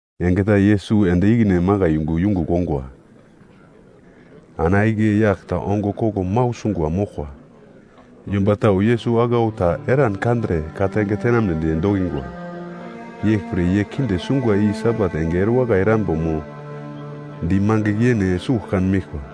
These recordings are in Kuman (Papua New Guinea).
Enge ta Yesus ende ikine makai yungu yungugl ongwa, ana igle yagl ta ongo koglo mau sungwa moglkwa. Yomba tau Yesus aglau ta eran kandre ka-tange tenamnedi dokingwa. Yeglpre ye kinde sungwa i Sabat enge erewakai erambo mo di mangigl yene sugl kan meglkwa.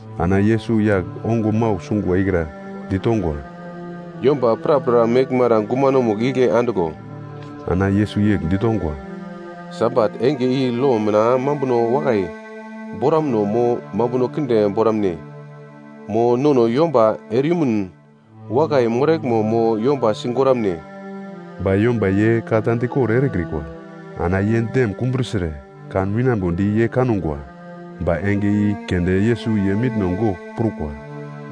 Ana Yesus yagl ongo mau sungwa ikra ditongwa, “Yomba prapra meglmara gumanomugl igle andiglo.” Ana Yesus yegl ditongwa, “Sabat enge i lo mina mambuno wakai boramuno mo mambuno kinde boramune? Mo nono yomba ereyumun wakai moraglmo mo yomba sigoramne?” Ba yomba ye ka ta dikor erekrikwa. Ana ye dem kumbrusire kan winambodi ye kangwa, ba enge i keunde Yesus ye mitno gogl prukwa,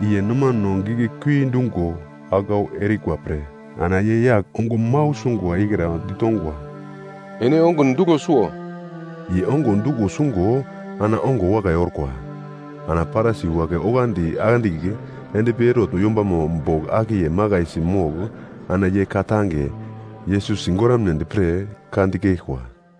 i ye nomano giglekui dungo aglau erikwa pre. Ana ye yagl ongo mau sungwa ikra ditongwa, “Ene ongun duglo suwo.” Ye ongo duglo sungo ana ongo wakai orkwa. Ana Parisi wagle oglandi andigl endpi Herot yombamo bogl akiye makaisi mogl ana ye ka-tange Yesus sigoramnedi pre ka dikeglkwa.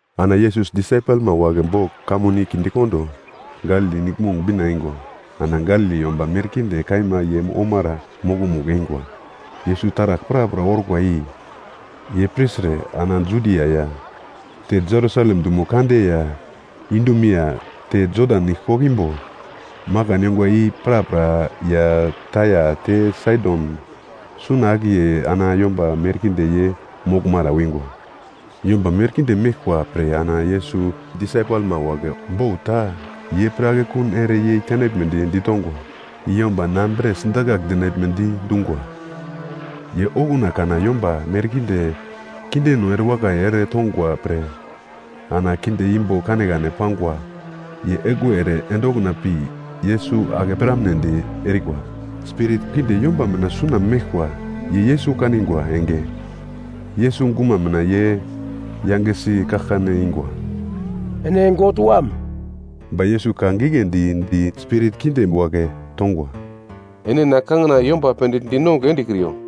Ana Yesus disaipelma wagle bogl kamun i kindekondo, Galili Niglmong bina eingwa. Ana Galili yomba merkinde kaima ye omara mokomugl eingwa. Yesus taragl prapra orkwa i ye pirtre ana Judia ya te Jerusalem dumo kande ya Idumea te Jodan Nigle koglo imbo, makan yongwa i prapra ya Taia te Saidon suna akiye ana yomba merkinde ye moglmara wingwa. Yomba merkinde meglkwa pre ana Yesus disaipelma wagle bot ta ye pre akekun ere yei tenaglmedi ditongwa, i yomba na bre sidakagl dinaglmedi dungwa. Ye okuna kana yomba merkinde kindeno erewakai ere tongwa pre. Ana kinde imbo kanekane pangwa, ye egluwe ere ende okuna pi Yesus ake piramnedi erikwa. Spirit kinde yomba mina suna meglkwa ye Yesus kanigwa enge, Yesus guma mina ye yangesi kaglkane ingwa, “Ene God Wam.” Ba Yesus ka giglendi di spirit kinde wagle tongwa, “Ene na kangina yomba pendigl dinongugl endekriyo.”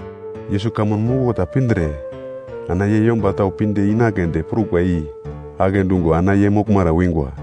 Yesus kamun muglo ta pindre ana ye yomba tau pinde inagledi prukwa i agle dungo ana ye moglmara wingwa.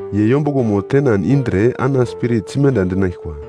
Ye yombuglomo tenan indre ana spirit simenda endinaglkwa.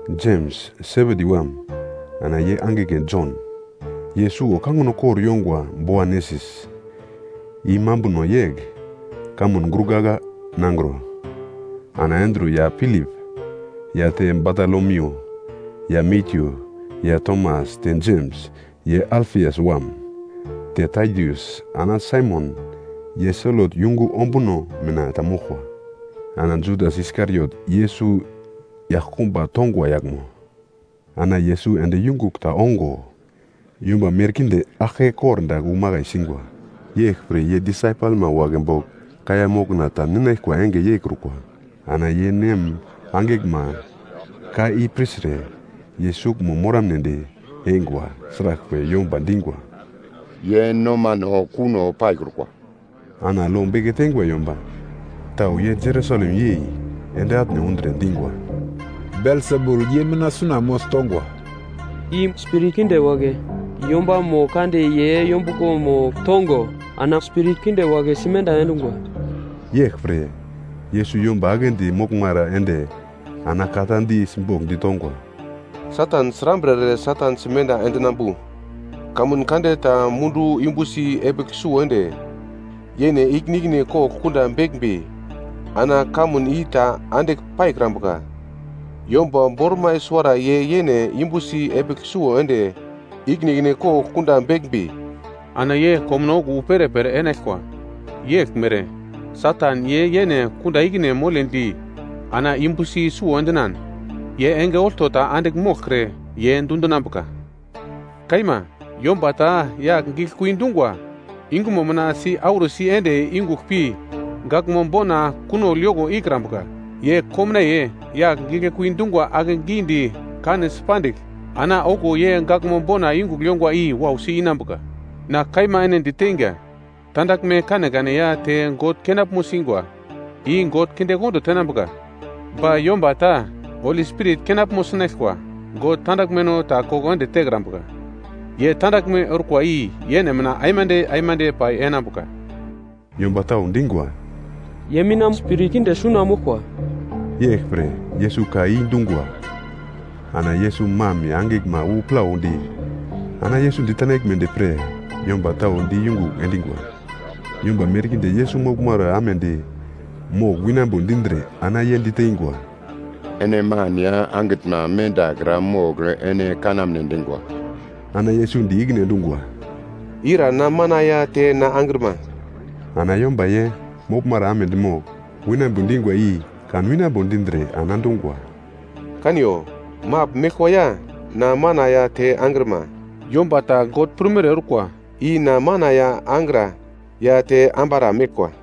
Jems, Sebedi wam, ana ye angigle Jon (ye suwo kangino kor yongwa Boanesis, i mambuno yegl, “Kamun Gurgagla Nangro”); ana Andru ya Pilip ya te Batolomiu ya Matyu ya Tomas te Jems, ye Alfias wam; te Tadius ana Saimon, ye Selot yungu ombuno mina ta moglkwa. Ana Judas Iskariot Yesus yaglkumba tongwa yaglmo. Ana Yesus ende yungugl ta ongo, yomba merkinde aglke kordagl wu makai singwa. Yeglpre ye disaipelma wagle bogl kaiya mokna ta ninaglkwa enge yeikrukwa. Ana ye nem-angiglma ka i pirtre ye suglmo moramnedi eingwa, sraglpre, yomba dingwa, “Ye nomano kuno paikrukwa.” Ana lo beke teingwa yomba tau ye Jerusalem yei ende atne undre dingwa, “Belsebul ye mina suna mogl tongwa! I spirit kinde wagle yombamo kande ye yombuglomo tongo ana spirit kinde wagle simenda endungwa.” Yeglpre, Yesus yomba aglendi moglmara ende ana ka ta di simbogl ditongwa, “Satan srambre ere Satan simenda endinambu? Kamun kande ta mundu yumbusi epigl suwo ende yene ikine ikine kogl kunda beglmbi ana kamun i ta andigl paikrambuka. Yomba bormai suwara ye yene yumbusi epigl suwo ende ikine ikine kogl kunda beglmbi, ana ye komuno okuwo wu perepere enaglkwa. Yeglmere, Satan ye yene kunda ikine moledi ana yumbusi suwo endinan, ye enge olto ta andigl moglkre, ye dundinambuka. Kaima, yomba ta yagl giglekui dungwa yungumo mina si-arusi ende yungugl pi gaglmo bona kunogl yoko ikrambuka. Ye komnaiye yagl giglekui dungwa akegidi kanesi pandigl, ana okuwo ye gaglmo bona yungugl yongwa i wausi inambuka. Na kaima ene diteinga, tandaglme kanekane ya te God kenaglmo singwa, i God kindekondo tenambuka. Ba yomba ta Holi Spirit kenaglmo sinaglkwa, God tandaglmeno ta koko ende tekrambuka. Ye tandaglme orkwa i yene mina aimande aimande pai enambuka.” Yomba tau dingwa, “Ye mina spirit kinde suna moglkwa.” Yeglpre, Yesus ka i dungwa. Ana Yesus mam ya angiglma wu plaudi, yungu mendakra andigl mogl, ana Yesus ditenaglmedi pre yomba tau di yungugl endingwa. Yomba merkinde Yesus moglmara amedi mogl winambo dindre ana ye diteingwa, “Ene man ya angitnma mendakra mogl ene kanamne dingwa.” Ana Yesus di ikine endungwa, “Ira na mana ya te na angrima?” Ana yomba ye moglmara amedi mogl winambo dingwa i kan winambo dindre ana dungwa, “Kaniyo, magl meglkwa ya na mana ya te angrima! Yomba ta God prumere orkwa, i na mana ya angra ya te ambara meglkwa.”